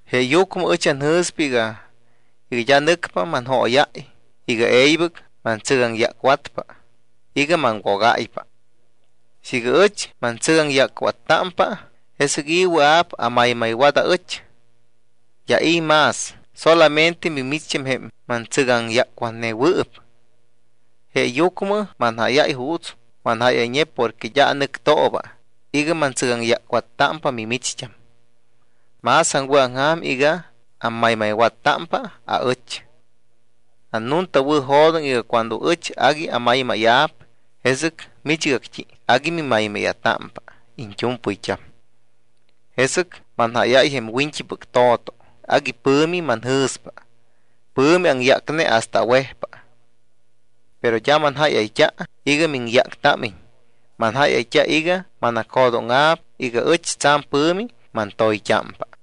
Jeeyucmɨ ɨch anjɨ̱s iga d́a nɨcpa manjóyáy iga e̱ybɨc mantsɨgaŋyácwatpa iga maŋwogáypa. Siiga ɨch mantsɨgaŋyácwattámpa, ¿jesɨc i̱ wɨa̱p amaymaywat aɨch? D́a i̱ más, solamente mimicht́am jém mantsɨgaŋyácwatnewɨɨp. Jeeyucmɨ manjáyáy juuts manjáyayñe porque d́a anɨctooba iga mantsɨgaŋyácwattámpa mimicht́am. Más aŋwɨ̱aŋja̱m iga ammaymaywattámpa aɨch. Annuntawɨ̱jo̱doŋ iga cuando ɨch agui amaymáya̱p, jesɨc michgact́i agui mimaymáya̱támpa iñt́u̱mpɨyt́am. Jesɨc manjáyáy jém wiñt́ipɨc to̱to, agui pɨ̱mi manjɨ̱spa, pɨ̱mi aŋyácne hasta awejpa. Pero d́a manjáyayt́a iga miŋyáctámiñ, manjáyayt́a iga manacjo̱dóŋa̱p iga ɨch tsa̱m pɨ̱mi mantoyt́ámpa.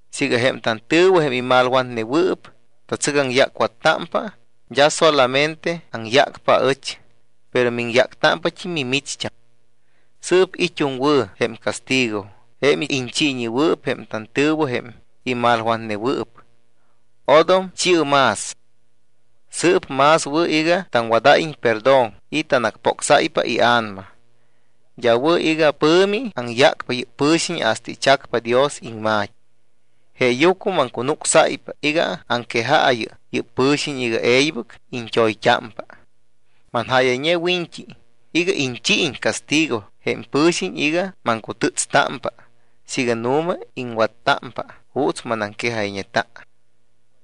Siiga jém tantɨ̱wɨ, jém imalwatnewɨɨp, tatsɨgaŋyácwattámpa, d́a solamente aŋyácpa aɨch, pero miŋyáctámpat́im mimicht́am. Sɨɨp it́um wɨ̱ jém castigo, jém iñchiiñewɨɨp jém tantɨ̱wɨ jém imalwatnewɨɨp. Odom chi̱ɨ más. Sɨɨp más wɨ̱ iga taŋwadáyiñ perdón y tanacpocsáypa ia̱nama. D́a wɨ̱ iga pɨ̱mi aŋyácpa yɨ́p pɨ̱xiñ hasta ichacpa Dios iŋma̱t́i. Jeeyucmɨ maŋcunucsáypa iga aŋquejaayɨ yɨ́p pɨ̱xiñ iga e̱ybɨc iñt́oyt́ámpa. Manjáyayñe wiñt́i iga iñchiiñ castigo jém pɨ̱xiñ iga maŋcutɨ́tstámpa siiga nu̱ma iŋwattámpa juuts manaŋquejayñeta.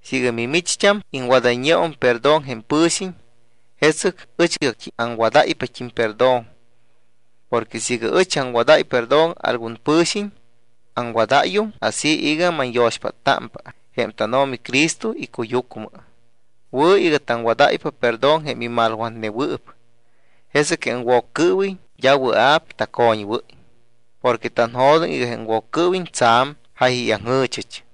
Siiga mimicht́am iŋwadayñeum perdón jém pɨ̱xiñ, jesɨc ɨchgact́i aŋwadáypat́im perdón. Porque siiga ɨch aŋwadáy perdón algun pɨ̱xiñ, aŋwadáyum así iga manyo̱xpáttámpa jém tánO̱mi Cristo icuyucmɨ. Wɨ̱ iga taŋwadáy perdón jém imalwatnewɨɨp, jesɨc jém Woccɨɨwiñ d́a wɨa̱p tacoñwɨ́y. Porque tanjo̱doŋ iga jém Woccɨɨwiñ tsa̱m jáyayaŋjɨ̱chɨch.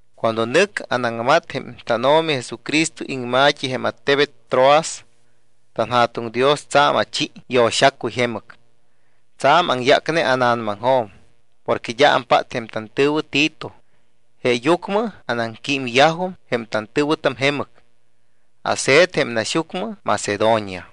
Cuando nɨc anaŋmat jém tánO̱mi Jesucristo iŋma̱t́i jém attebet Troas, tanJa̱tuŋ Dios tsa̱m achi yo̱xacuy jemɨc. Tsa̱m aŋyácne ána̱namaŋjo̱m porque d́a ampát jém tantɨ̱wɨ Tito. Jeeyucmɨ anaŋquímyajum jém tantɨ̱wɨtam jemɨc, ase̱t jém naxyucmɨ Macedonia.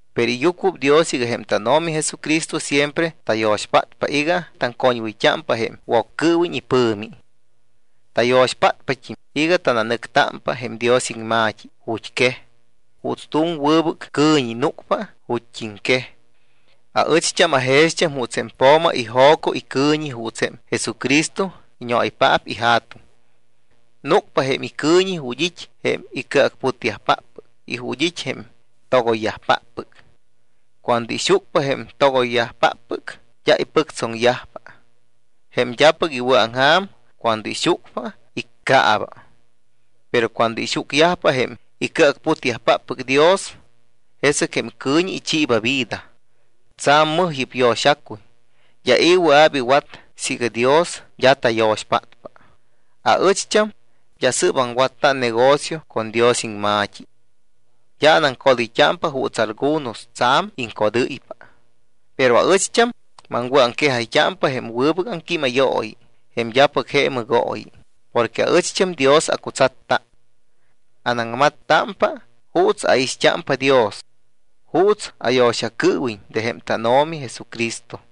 Pero iyucuɨpdios iga jém tánO̱mi Jesucristo siempre tayo̱xpátpa iga taŋcoñwɨyt́ámpa jém Woccɨɨwiñ ipɨ̱mi. Tayo̱xpátpat́im iga tananɨctámpa jém Dios iŋma̱t́i ju̱t́quej juuts tu̱m wɨbɨc cɨ̱ñi núcpa ju̱t́iŋquej. Aɨcht́am ajext́am juuts jém po̱ma ijo̱co icɨ̱ñi juuts jém Jesucristo iñoaypaap iJa̱tuŋ. Núcpa jém icɨ̱ñi ju̱t́ it́ jém icɨacputyajpáppɨc y ju̱t́ it́ jém togoyyajpáppɨc. Cuando ixucpa jém togoyyajpáppɨc, d́a ipɨctsoŋyajpa. Jém d́apɨc iwɨ̱aŋja̱m cuando ixucpa, iccaaba. Pero cuando ixucyajpa jém icɨacputyajpáppɨc Dios, jesɨc jém cɨ̱ñi ichiiba vida. Tsa̱m mɨj yɨ́p yo̱xacuy, d́a i̱ wɨa̱p iwat siiga Dios d́a tayo̱xpátpa. Aɨcht́am d́a sɨ́p aŋwatta negocio con Dios iŋma̱t́i. D́a anaŋcodɨyt́ámpa juuts algunos tsa̱m iŋcodɨ́ypa. Pero aɨcht́am maŋwɨ̱aŋquejáypa jém wɨbɨc aŋquímayooyi, jém d́apɨc je mɨgooyi, porque aɨcht́am Dios acutsatta. Anaŋmattámpa juuts aixt́ámpa Dios, juuts ayo̱xacɨɨwiñ de jém tánO̱mi Jesucristo.